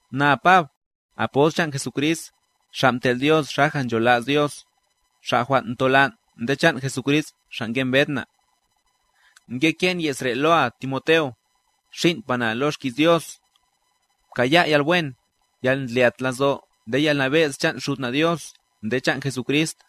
Na Pab, apost chan' Jesucrist, xa' mtel' Dios xaja nchola's Dios, Xa' jwan' ntolan' nde chan' Jesucrist Xa' ngembed na'. Ngeke'n ye's re' loa Timoteo, xin'pa na lo xki's Dios. Pkaya' yalwen, yalndlyat lazo' nde yalnabe'z chan' Xud na' Dios nde chan' Jesucrist.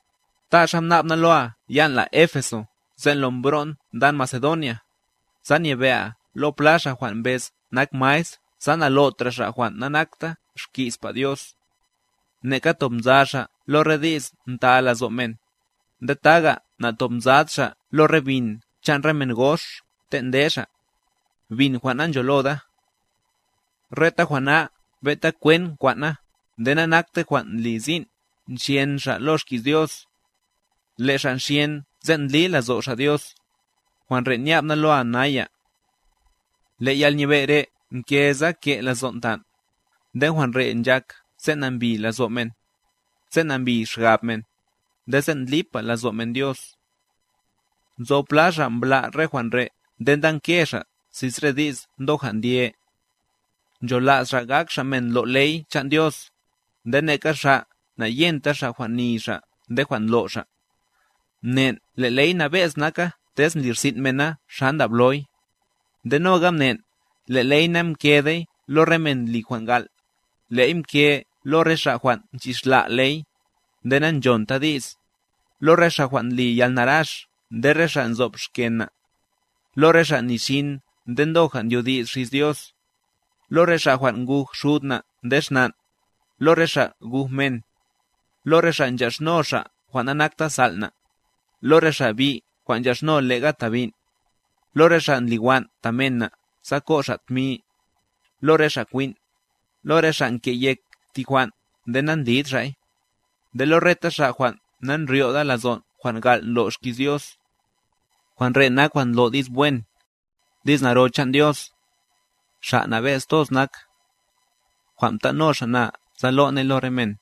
Ta xa mna'b na loa yan' la Éfeso sen' lo mbro'n ndan Macedonia, sa nyebe'a lo pla xa' jwan' mbez nak maestr sa nalo'tra' xa' jwan' nanakta xki'spa Dios, neka tob nza xa' lo re di's nta lazo' men, nde taga' natobnzad xa' lo re bin chan' re men gox ten' nde xa', bin jwan' nancholoda. Reta jwan' na ben'ta kwent nkwan' na nde nanaktey jwan' ndli sin' nxyen xa' lo xki's Dios, le' xa' nxyen sen' ndli lazo' xa' Dios, jwan' re' nya'b na loa naya. Le' yalnyebe' re' mke sa ke' lazon' tan', nde jwan' re' nchak sen' nambi lazo' men, sen' nambi xgab men, nde sen' ndli'pa lazo' men Dios. Nzo pla xa' mbla' re jwan' re' nde ndanke xa' xis re di's ndoja' ndye. Nchola's xa' gak xa' men ndlo' ley chan' Dios, nde neka xa' nayenta xa' jwan' ni xa' nde jwan' ndlo' xa'. Mnen' le' ley nabe'z naka tez ndli rsin' mena xa ndabloy. Nde noga mnen', le' ley namkedey lo re men ndli jwan' gal', le'y mke lo re xa' jwan' nchixla' ley, nde nanchonta di's, lo re xa' jwan' ndli yalnarax nde re xa' nzo'b xken na', lo re xa' nixin nde ndoja' ndyodi's xis Dios, lo re xa' jwan' nguj xud na' nde xnan', lo re xa' guj men, lo re xa' nchaxno xa' jwan' nanakta sal' na', lo re xa' bi' jwan' nchaxno lega ta bin', lo re xa' ndliwan' ta men na' sa ko' xa' tmi, lo re xa' kwin', lo re xa' nke'yek thi jwan' nde nandlid xa'y, nde lo reta xa' jwan' nandryoda lazon' jwan' gal' ndlo' xki's Dios. Jwan' re' nak jwan' ndlo' di's wen, di's naro chan' Dios, Xa' nabe'z toz nak, jwan' mtan' no Xa' na sa lo' ney lo re men.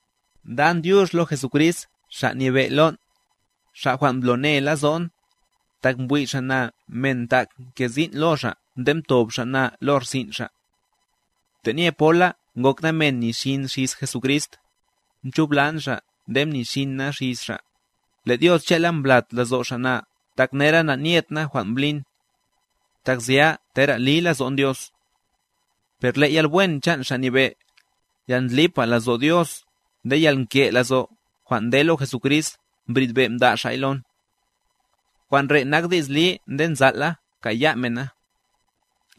Ndan dyux lo Jesucrist Xa' Nyebe' lon', Xa' jwan' mblone lazo'n, tak mbwi' Xa' na men tak ke sin' lo Xa' nde mtob Xa' na lo rsin' Xa'. Tenye pola ngok na men mni xin xis Jesucrist, mchublan Xa' nde mnixin na xis Xa'; le' Dios che'la mblat lazo' Xa' na tak nera nanyet na jwan' mblin, tak zya tera' li lazo'n Dios. Per le' yalwen chan' Xa' Nyebe', yalndlipa' lazo' Dios nde yalnke' lazo' jwan' nde lo Jesucrist mbridbe' mda' Xa'y lon. Jwan' re' nak di's li nde nzal' la kaya' men na: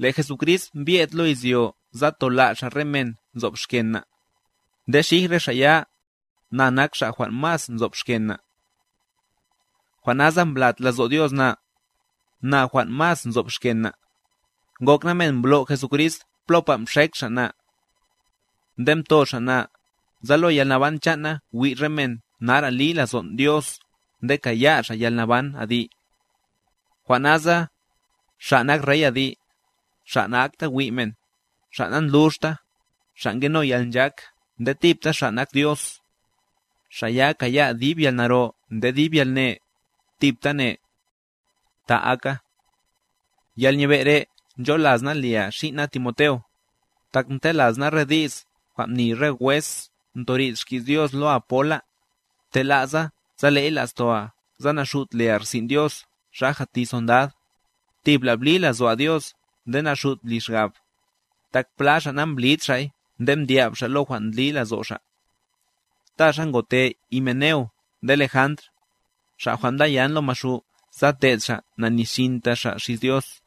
Le' Jesucrist mbye'd lo izyo sa tola' Xa' re men nzo'b xken na', nde xij re xa' ya, na nak xa' jwan' mas nzo'b xken na'. Jwan' nasa mblat lazo' Dios na, na jwan' mas nzo'b xken na', ngok na men mblo' Jesucrist plopa mxek Xa' na. Nde mto Xa' na, sa lo yalnaban chan' na wi' re men nara' li lazon' Dios nde kaya' xa' yalnaban adi'. Jwan' nasa, Xa' nak Rey adi', Xa' na'akta wi' men, Xa' nandluxta, Xa' ngeno yalnchak nde thibta Xa' nak Dios, Xa' ya kaya' dib yalnaro nde dib yalne, thibtane. Ta aka. Yalnyebe' re' ncholas na lia xin' na Timoteo, tak ntelas na re di's jwan' mni re wes mtori'd xki's Dios loa pola, ptela'sa sa le'y la'stoa sa naxut lia rsin' Dios xaja' thi sondad, thibla' bli lazo'a Dios nde naxut bli xgab, tak pla xa' na'mblid xa'y nde mdya'b xa' lo jwan' ndli lazo' xa'. Ta xa ngote Himeneo nde Lejandr, xa' jwan' mdaya'n lo Maxu' sa te'd xa' nanixinta xa' xis Dios.